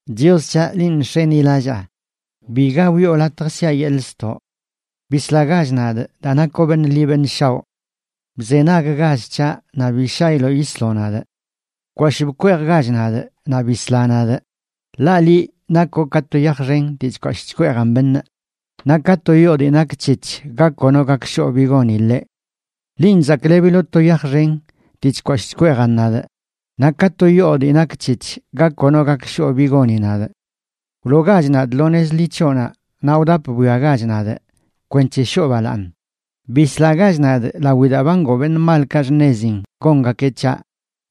Chios c̱haꞌ, linꞌ nx̱enilallaa; biga wiꞌo latj siꞌa yeḻꞌ ztoꞌ. Bislagach nadꞌ, daa nakoꞌ beṉꞌ ḻi beṉꞌ shaoꞌ. Bzenaggach c̱haꞌ, naꞌ bi shailoꞌ yisloꞌ nadꞌ. Bkwashꞌ bkweejgach nadꞌ naꞌ bisla nadꞌ ḻaꞌ liꞌ nakoꞌ ka to yaj xen dii chkwashꞌ chkweejan beṉꞌ, naꞌ ka to yoo dii nak c̱hec̱h ga kono gak shoꞌ bi goni ḻeꞌ. Linꞌ zaklebiloꞌ to yaj xen dii chkwashꞌ chkweejan nadꞌ, naꞌ ka to yoo dii nak c̱hec̱h ga kono gak shoꞌ bi goni nadꞌ. Wloogach nadꞌ lo nez ḻi c̱hoꞌnaꞌ naꞌ wdap bwiagach nadꞌ kwenc̱he shoo balaaṉ. Bislagach nadꞌ lawi daa ba ngoo beṉꞌ malkaꞌ xṉezin gongakeꞌ c̱haꞌ,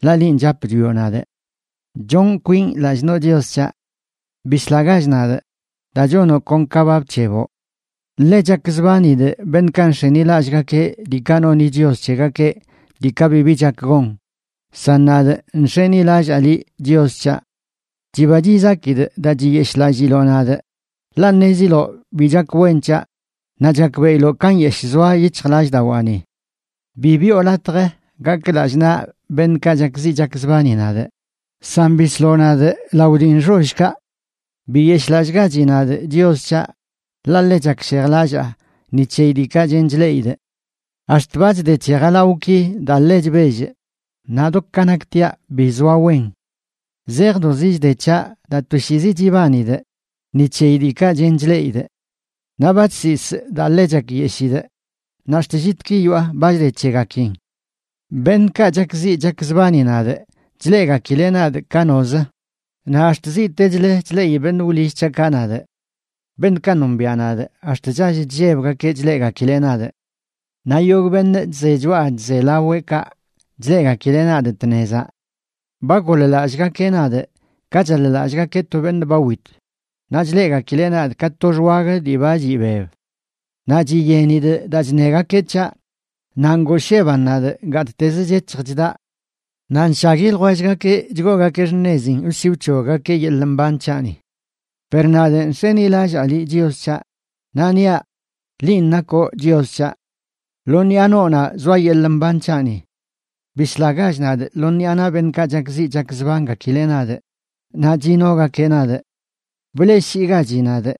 ḻaꞌ linꞌ chap chwioꞌ nadꞌ. Chonꞌ kwinꞌ lallꞌ noꞌ, Chios c̱haꞌ. Bislagach nadꞌ, daa chonoꞌ kon ka ba bc̱heboꞌ. Ḻe chakzbanidꞌ beṉꞌkaꞌ nx̱enilallꞌgakeꞌ diikaꞌ noni chios c̱hegakeꞌ, diikaꞌ bibi chak gon, san nadꞌ nx̱enilallaa liꞌ, Chios c̱haꞌ. Chiba chizakidꞌ daa chiyeshꞌlalliloꞌ nadꞌ, ḻaꞌ ṉeziloꞌ bi chak wen c̱haꞌ naꞌ chakbeꞌiloꞌ ka nyeshꞌ zoa yic̱hjlallꞌdawaani. Bi biꞌo latj gakꞌ lallꞌ naꞌ beṉꞌkaꞌ chakziꞌ chakzbani nadꞌ, san bisloꞌ nadꞌ lao dii nxollkaꞌ. Biyeshꞌlallꞌgachi nadꞌ, Chios c̱haꞌ, ḻaꞌ ḻe chakshejlallaa ni c̱heyi diikaꞌ chen chleꞌidꞌ. Ax̱t ba chde c̱he jalawꞌki daa ḻe chbellꞌ, naꞌ do ka naktiaꞌ bi zoa wen. Zejdozi chde c̱haꞌ daa toshiizi chibanidꞌ ni c̱heyi diikaꞌ chen chleꞌidꞌ. Naꞌ ba chsisꞌ daa ḻe chakyeshidꞌ, naꞌ ax̱t llitki yoꞌa ba chde c̱hegakin. Beṉꞌkaꞌ chakziꞌ chakzbani nadꞌ chleꞌgakileꞌ nadꞌ ka nozə, naꞌ ax̱t ziꞌtechlə chleꞌi beṉꞌ wlill c̱haꞌkaꞌ nadꞌ. Beṉꞌkaꞌ nombiaꞌ nadꞌ ax̱t chall chllebgakeꞌ chleꞌgakileꞌ nadꞌ. Naꞌ yogꞌ beṉꞌ chze choꞌa chze laweꞌka chleꞌgakileꞌ nadꞌ tnezaꞌ. Ba goḻ-lallꞌgakeꞌ nadꞌ ka chaḻ-lallꞌgakeꞌ to beṉꞌ ba wit; naꞌ chleꞌgakileꞌ nadꞌ ka to xwag dii ba chiꞌbeb. Naꞌ chiyenidꞌ daa chṉegakeꞌ c̱haꞌ, naꞌ ngoosheban nadꞌ gattezə chec̱hj chdaꞌ. Naꞌ nshagui ljwellgakeꞌ chgoogakeꞌ xṉezin wsi wc̱hoggakeꞌ yeḻꞌ mban c̱haꞌni. Per nadꞌ nx̱enilallaa liꞌ, Chios c̱haꞌ, naꞌ niaꞌ: “Linꞌ nakoꞌ Chios c̱haꞌ.” Lo ṉiꞌa noonaꞌ zoa yeḻꞌ mban c̱haꞌni. Bislagach nadꞌ lo ṉiꞌa naꞌ beṉꞌkaꞌ chakziꞌ chakzbangakileꞌ nadꞌ naꞌ chinogakeꞌ nadꞌ. Bleꞌshiigachi nadꞌ,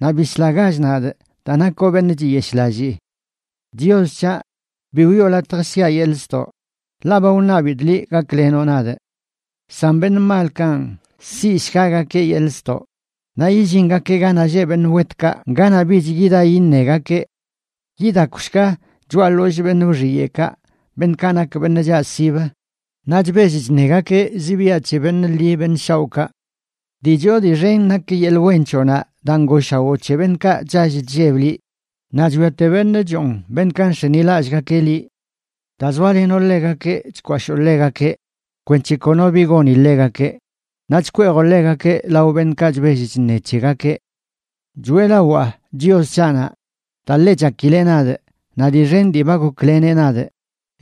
naꞌ bislagach nadꞌ daa nakoꞌ beṉꞌ chiyeshꞌlallii. Chios c̱haꞌ, bi wiꞌo latj siꞌa yeḻꞌ ztoꞌ, ḻaꞌ ba wṉabidꞌ liꞌ gaklenoꞌ nadꞌ. San beṉꞌ malkanꞌ siꞌshgagakeꞌ yeḻꞌ ztoꞌ, naꞌ yillingakeꞌ ganaꞌ lleꞌ beṉꞌ wetkaꞌ ganaꞌ bich yida yiṉegakeꞌ. Yidakwshga choꞌa ḻollꞌ beṉꞌ wxiyeꞌkaꞌ, beṉꞌkaꞌ nak beṉꞌ chaꞌsib naꞌ chbell chṉegakeꞌ zibiaꞌ c̱he beṉꞌ ḻi beṉꞌ shaoꞌkaꞌ. Dii choo dii xen nak yeḻꞌ wen c̱hoꞌnaꞌ daa ngooshawoo c̱he beṉꞌkaꞌ chall chlleb liꞌ, naꞌ chwiate beṉꞌ choon beṉꞌkaꞌ nx̱enilallꞌgakeꞌ liꞌ. Daa zoalenoꞌ ḻegakeꞌ chkwashoo ḻegakeꞌ kwenc̱he kono bi goni ḻegakeꞌ, naꞌ chkweejoꞌ ḻegakeꞌ lao beṉꞌkaꞌ chbell chṉe c̱hegakeꞌ. Choeꞌlawaa Chios c̱haꞌnaꞌ, daa ḻe chakileꞌ nadꞌ naꞌ dii xen dii ba gokleneꞌ nadꞌ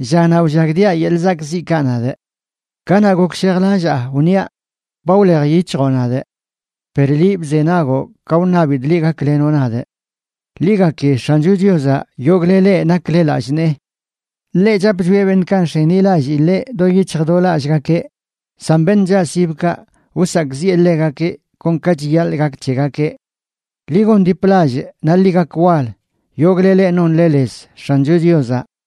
llanaꞌ wllagdiaꞌ yeḻꞌ zakꞌziꞌkaꞌ nadꞌ. Kanaꞌ gokshejlallaa wniaꞌ: “Ba wlej yic̱hjoꞌ nadꞌ”; Per liꞌ bzenagoꞌ ka wṉabidꞌ liꞌ gaklenoꞌ nadꞌ. Ḻi gaki X̱ancho Chiozaꞌ, yogꞌle leꞌ nakle lallꞌ nee. Ḻeꞌ chap chwieꞌ beṉꞌkaꞌ nx̱enilallii ḻeꞌ do yic̱hj do lallꞌgakeꞌ, san beṉꞌ chaꞌsibkaꞌ, wsakꞌziꞌe ḻegakeꞌ kon ka chiyaḻꞌ gak c̱hegakeꞌ. Ḻi gondiplallꞌ naꞌ ḻi gak wal yogꞌle leꞌ nonle lez X̱ancho Chiozaꞌ.